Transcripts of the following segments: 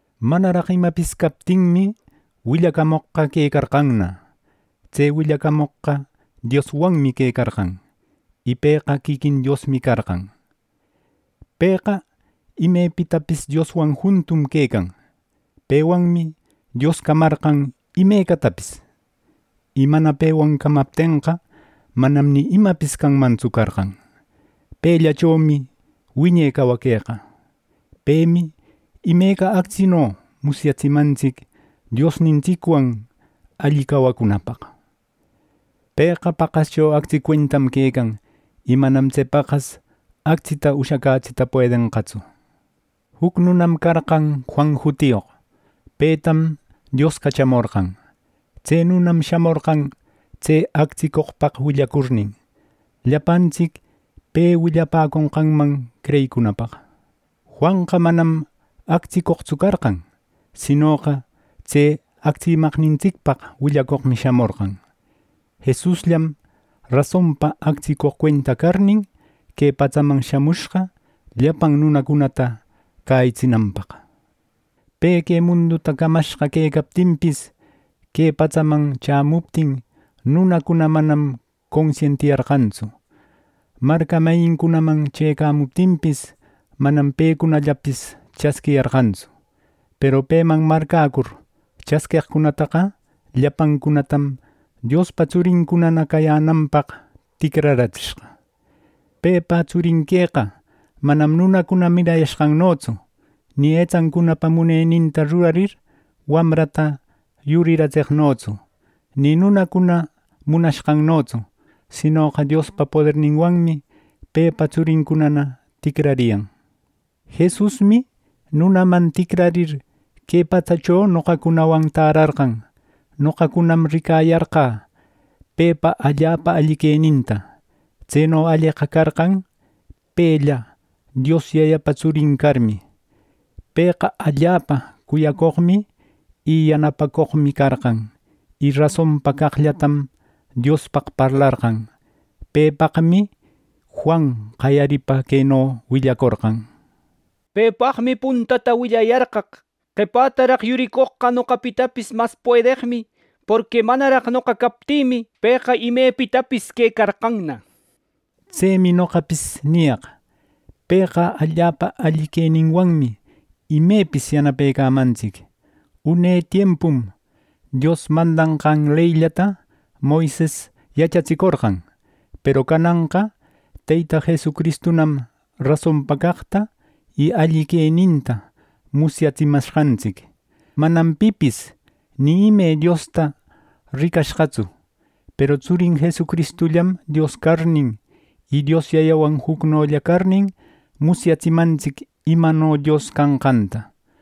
Manaraq imapis captinmi, willacamoqqa quecarqanna. Tse willacamoqqa Dioswanmi quecarqan, y Pëqa quiquin Diosmi carqan. Pëqa imepitapis Dioswan juntum quecan. Pewanmi Dios camarqan imecatapis, y mana pewan camaptenqa, manam ni imapis canmantsu carqan. Pellachomi wiñe cawaqueqa. Pemi imeca actsino musyatsimantsic Diosnintsicwan alli cawacunapaq. Pëqa paqascho actsi cuentam quecan, y manam tse paqas actsita ushacätsita puedenqatsu. Juc nunam carqan Juan jutiyoq; petam Dios cachamorqan. Tse nunam shamorqan tse actsicoqpaq willacurnin, llapantsic pe willapäconqanman creyicunapaq. Juanqa manam actsicoqtsu carqan, sinoqa tse actsimaqnintsicpaq willacoqmi shamorqan. Jesusllam rasonpa actsicoq cuenta carnin, que patsaman shamushqa llapan nunacunata cäyitsinanpaq. Pe que munduta camashqa quecaptinpis, que patsaman chämuptin, nunacuna manam consientiyarqantsu. Marca mayincunaman chëcamuptinpis, manam pecunallapis chasquiyarqantsu. Peru peman marcäcur chasqueqcunataqa llapancunatam Diospa tsurincunana cayänanpaq ticraratsishqa. Pepa tsurin queqa manam nunacuna mirayashqannotsu, ni etsancunapa muneninta rurarir wamrata yuriratseqnotsu, ni nunacuna munashqannotsu, sinoqa Diospa poderninwanmi pepa tsurincunana ticrariyan. Jesusmi nunaman ticrarir, que patsacho noqacunawan tärarqan. Noqacunam ricayarqä pepa allapa alli queninta. Tseno alleqa carqan pella Dios Yayapa tsurin carmi. Pëqa allapa cuyacoqmi y yanapacoqmi carqan, y rasonpa caqllatam Diospaq parlarqan. Pepaqmi Juan qayaripa queno willacorqan: “Pepaqmi puntata willayarqaq: ‘Qepätaraq yuricoqqa noqapitapis mas puedeqmi, porqui manaraq noqa captïmi pëqa imepitapis quecarqanna’” nir. Tsemi noqapis niyaq: Pëqa allapa alli queninwanmi imepis yanapecamantsic. Une tiempum Dios mandanqan leyllata Moises yachatsicorqan. Peru cananqa Teyta Jesucristunam rasonpa caqta y alli queninta musyatsimashqantsic. Manam pipis ni ime Diosta ricashqatsu. Peru tsurin Jesucristullam Dios carnin, y Dios Yayawan jucnolla carnin, musyatsimantsic imano Dios canqanta.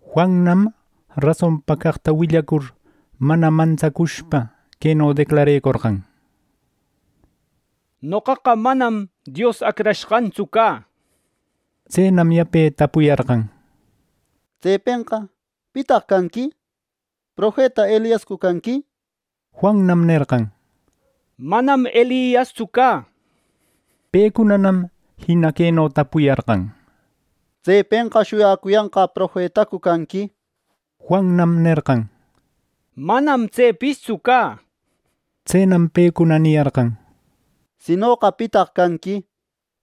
Juannam rasonpa caqta willacur, mana mantsacushpa queno declarecorqan: —Noqaqa manam Dios Acrashqantsu cä —nir. Tsenam yape tapuyarqan: —Tsepenqa ¿pitaq canqui? ¿Profeta Eliascu canqui? —nir. Juannam nerqan: —Manam Eliastsu cä —nir. Pecunanam jina queno tapuyarqan: —¿Tsepenqa shuyacuyanqä profetacu canqui? —nir. Juannam nerqan: —Manam tsepistsu cä —nishpa. Tsenam pecuna niyarqan: —Sinoqa ¿pitaq canqui?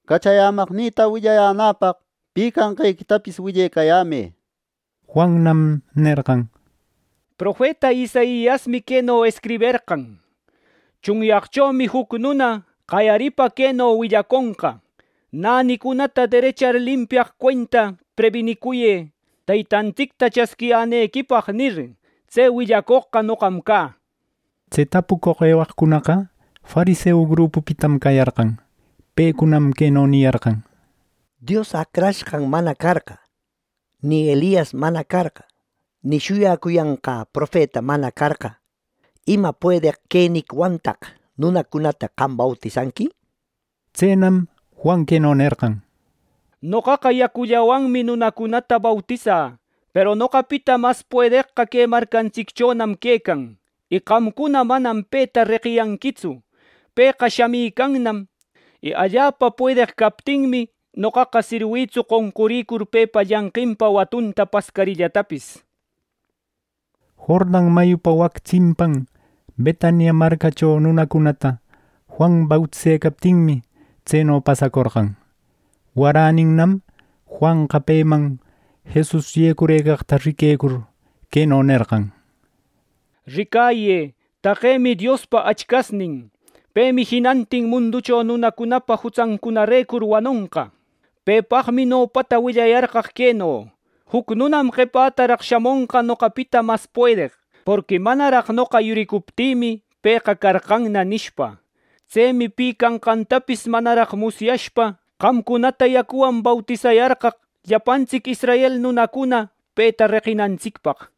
Cachayämaqnïta willayänäpaq pi canqequitapis willecayämë —nir. Juannam nerqan: —Profeta Isaiasmi queno escriberqan: ‘Tsunyaqchomi juc nuna qayaripa queno willaconqa, “Nänicunata derechar limpiaq cuenta prebinicuyë Teytantsicta chasquiyänequipaq” ’ —nir. Tse willacoqqa noqam cä. Tse tapucoq ewaqcunaqa fariseu grupupitam cayarqan. Pecunam queno niyarqan: —Dios Acrashqan mana carqa, ni Elias mana carqa, ni shuyacuyanqä Profeta mana carqa, ¿Ima puedeq queniquiwantaq nunacunata qam bautisanqui? —nir. Tsenam Juan queno nerqan: —Noqaqa yacullawanmi nunacunata bautisä, peru noqapita mas puedeqqa que marcantsicchonam quecan, y qamcuna manam peta reqiyanquitsu. Pëqa shamicannam, y allapa puedeq captinmi, noqaqa sirwïtsu qonquricur pepa llanqinpa watunta pascarillatapis —nir. Jordan mayupa wac tsimpan Betania marcacho nunacunata Juan bautisecaptinmi, tseno pasacorqan. Waräninnam, Juanqa peman Jesus yecurëcaqta riquecur, queno nerqan: “¡Ricayë, taqemi Diospa achcasnin. Pemi jinantin munducho nunacunapa jutsancunarecur wanonqa! Pepaqmi nopata willayarqaq queno: ‘Juc nunam qepätaraq shamonqa noqapita mas puedeq, porqui manaraq noqa yuricuptïmi, pëqa carqanna’ nishpa. Tsemi pi canqantapis manaraq musyashpa, qamcunata yacuwan bautisayarqaq llapantsic israel nunacuna peta reqinantsicpaq.”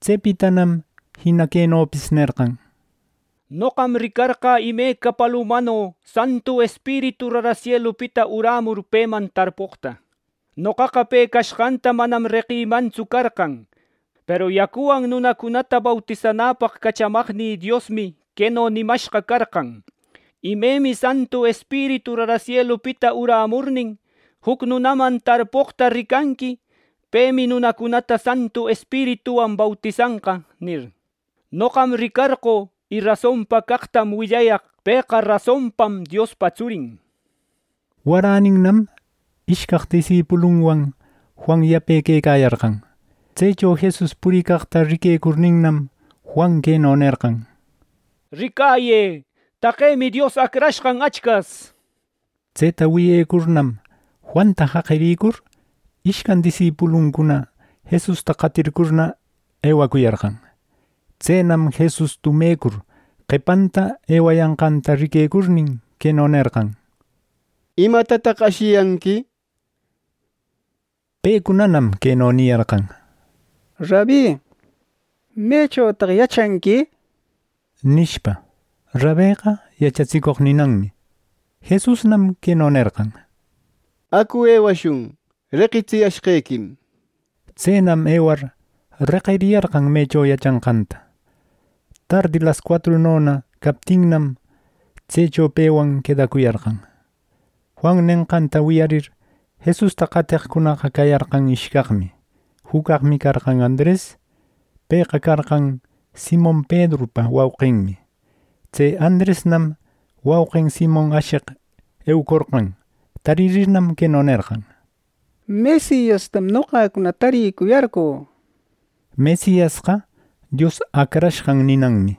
Tsepitanam jina quenopis nerqan: “Noqam ricarqä imeca palumano Santu Espiritu rara sielupita urämur peman tarpoqta. Noqaqa pe cashqanta manam reqïmantsu carqan, peru yacuwan nunacunata bautisanäpaq cachamaqnï Diosmi queno nimashqa carqan: ‘Imemi Santu Espiritu rara sielupita urämurnin, juc nunaman tarpoqta ricanqui, pemi nunacunata Santu Espirituwan bautisanqa’ nir. Noqam ricarqö, y rasonpa caqtam willayaq pëqa rasonpam Diospa tsurin.” Waräninnam ishcaq disipulunwan Juan yape quecayarqan. Tsecho Jesus puricaqta riquecurninnam, Juan queno nerqan: —¡Ricayë! ¡Taqemi Dios acrashqan achcas! —nir. Tseta wiyecurnam, Juanta jaqiricur, ishcan disipuluncuna Jesusta qatircurna eucuyarqan. Tsenam Jesus tumecur, qepanta ewayanqanta riquecurnin, queno nerqan: —¿Imatataq ashiyanqui? —nir. Pecunanam queno niyarqan: —Rabi, ¿mechotaq yachanqui? —nishpa. (Rabeqa “yachatsicoq” ninanmi.) Jesusnam queno nerqan: —Acu, ewashun. Reqitsiyashqequim —nir. Tsenam ewar, reqiriyarqan mecho yachanqanta. Tardi lascuatrunona captinnam, tsecho pewan quedacuyarqan. Juan nenqanta wiyarir, Jesusta qateqcunaqa cayarqan ishcaqmi; juc caqmi carqan Andres. Pëqa carqan Simon Pedrupa wauqinmi. Tse Andresnam wauqin Simon asheq eucorqan; taririrnam queno nerqan: —¡Mesiastam noqacuna taricuyarqö! —nishpa. (Mesiasqa Dios Acrashqan ninanmi.)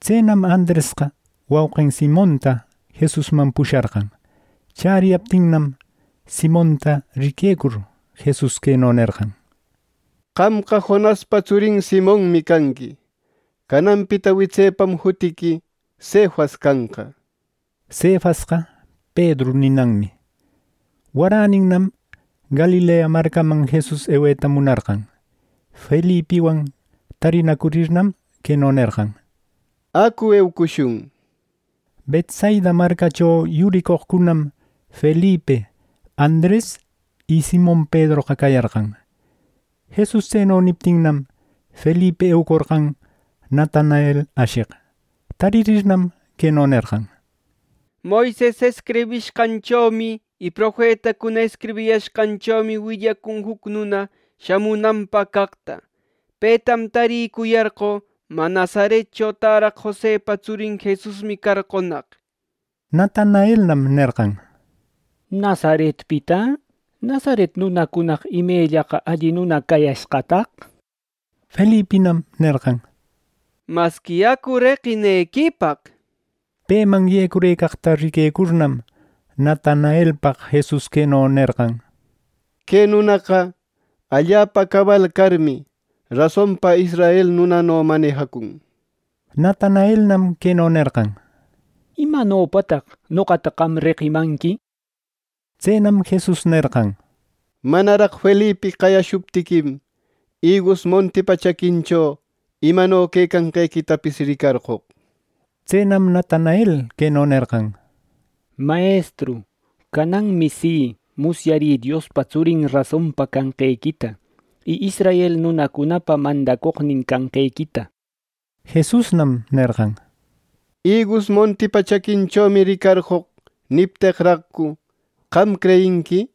Tsenam Andresqa wauqin Simonta Jesusman pusharqan. Chäriyaptinnam, Simonta riquecur, Jesus queno nerqan: —Qamqa Jonaspa tsurin Simonmi canqui. Cananpita witsepam jutiqui Cefas canqa (Cefasqa ‘Pedru’ ninanmi). Waräninnam Galilea marcaman Jesus eweta munarqan. Felipiwan tarinacurirnam, queno nerqan: —Acu, eucushun —nir. Betsaida marcacho yuricoqcunam Felipi, Andres y Simon Pedroqa cayarqan. Jesus tseno niptinnam, Felipi eucorqan Natanael asheq. Taririrnam, queno nerqan: —Moises escribishqanchomi y Profetacuna escribiyashqanchomi willacun juc nuna shamunanpaq caqta. ¡Petam taricuyarqö! Mä, Nazaretcho täraq Josepa tsurin Jesusmi carqonaq —nir. Natanaelnam nerqan: —¿Nazaretpita, Nazaret nunacunaqa imellaqa alli nuna cayashqataq! —nir. Felipinam nerqan: —¡Masqui acu reqinequipaq! —nir. Peman yecurëcaqta riquecurnam, Natanaelpaq Jesus queno nerqan: —Que nunaqa allapa cabal carmi, rasonpa israel nunano manejacun —nir. Natanaelnam queno nerqan: —¿Imanopataq noqata qam reqimanqui? —nir. Tsenam Jesus nerqan: —Manaraq Felipi qayashuptiquim, igus montipa chaquincho imano quecanqequitapis ricarqoq —nir. Tsenam Natanael queno nerqan: —Mayestru, ¡cananmi si, musyarï Diospa tsurin rasonpa canqequita, y israel nunacunapa mandacoqnin canqequita! Jesusnam nerqan: —¿Igus montipa chaquinchomi ricarqö nipteqraqcu, qam creyinqui?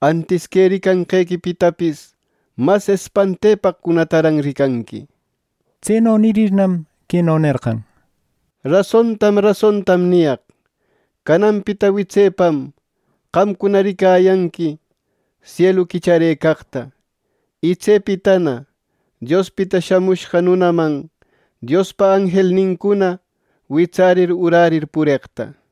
Antis que ricanqequipitapis mas espantepaqcunataran ricanqui —nir. Tseno nirirnam queno nerqan: —Rasontam rasontam niyaq. Cananpita witsepam qamcuna ricayanqui sielu quicharëcaqta, y tsepitana Diospita Shamushqa Nunaman Diospa anjelnincuna witsärir urärir pureqta —nir.